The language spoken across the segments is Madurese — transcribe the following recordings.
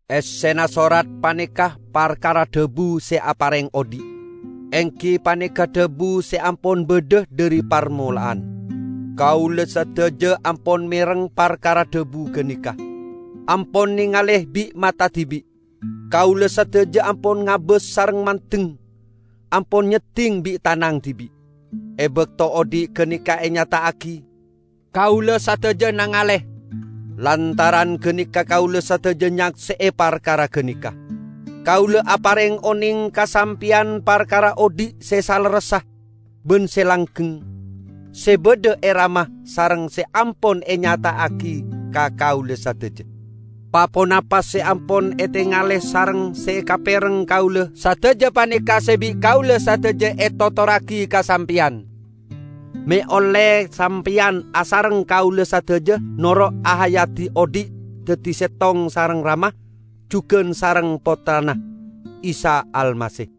Essena sorat paneka parkara Dhabu se apareng odhi', enggi paneka Dhabu se ampon badha dhari parmola'an. Kaula sadaja ampon mereng parkara dhabu ganeka, ampon nengale bi' mata dibi'. Kaula sadaja ampon ngabas sareng mandeng, ampon nyedding bi' tanang dibi'. E bakto odhi' ganeka enyata'agi, kaula sadaja nangale. Lantaran ganeka kaula sadaja nyakse'e parkara ganeka. Kaula apareng oneng ka sampeyan parkara odhi' se salerressa ban se langgeng, se badha e Rama sareng se ampon enyata'agi ka kaula sadaja. Pa-ponapa se ampon etengale sareng se ekapereng kaula sadaja paneka se bi' kaula sadaja etotorragi ka sampeyan, me' olle sampeyan asareng kaula sadaja noro' ahayadi odhi' daddi settong sareng Rama, jugan sareng Pottrana, Isa Almasih.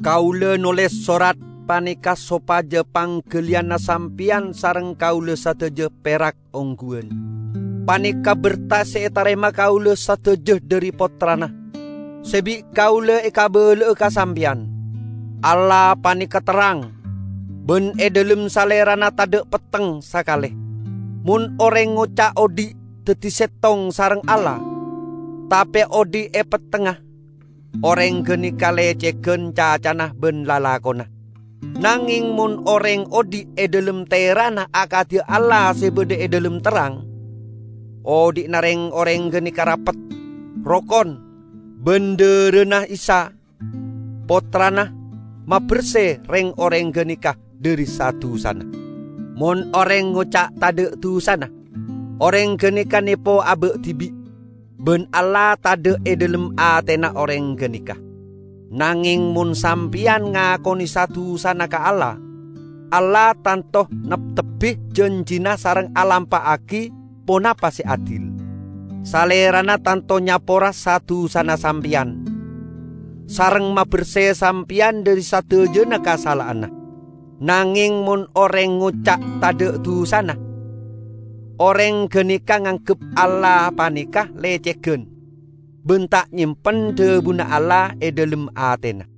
Kaula noles sorat paneka sopaja panggaliyanna sampeyan sareng kaula sadaja perak ongguwan. Paneka berta se etarema kaula sadaja dhari Pottrana, se bi' kaula ekabala'a ka sampeyan: Allah paneka terrang, ban e dhalem Salerana tadha' petteng sakale. Mon oreng ngoca' odhi' daddi settong sareng Allah, tape odhi' e pettengnga, oreng ganeka lecegan cacana ban lalakonna. Nangeng mon oreng odhi' e dhalem tera'na akadi Allah se badha e dhalem terrang, odhi'na reng-oreng ganeka rapet, rokon, ban dharana Isa, Pottrana, maberse reng-oreng ganeka dhari sa-dusana. Mon oreng ngoca' tadha' dusana, oreng ganeka nepo aba' dibi'; ban Allah tadha' e dhalem atena oreng ganeka. Nangeng mon sampeyan ngakone sa-dusana ka Allah, Allah tanto neptebbi janjina sareng alampa'agi ponapa se adil. Salerana tanto nyapora sa-dusana sampeyan, sareng maberse sampeyan dhari sadajana kasala'anna. Nangeng mon oreng ngoca' tadha' dusana, oreng ganeka nganggep Allah paneka lecegan, ban ta' nyempen dhabuna Allah e dhalem atena.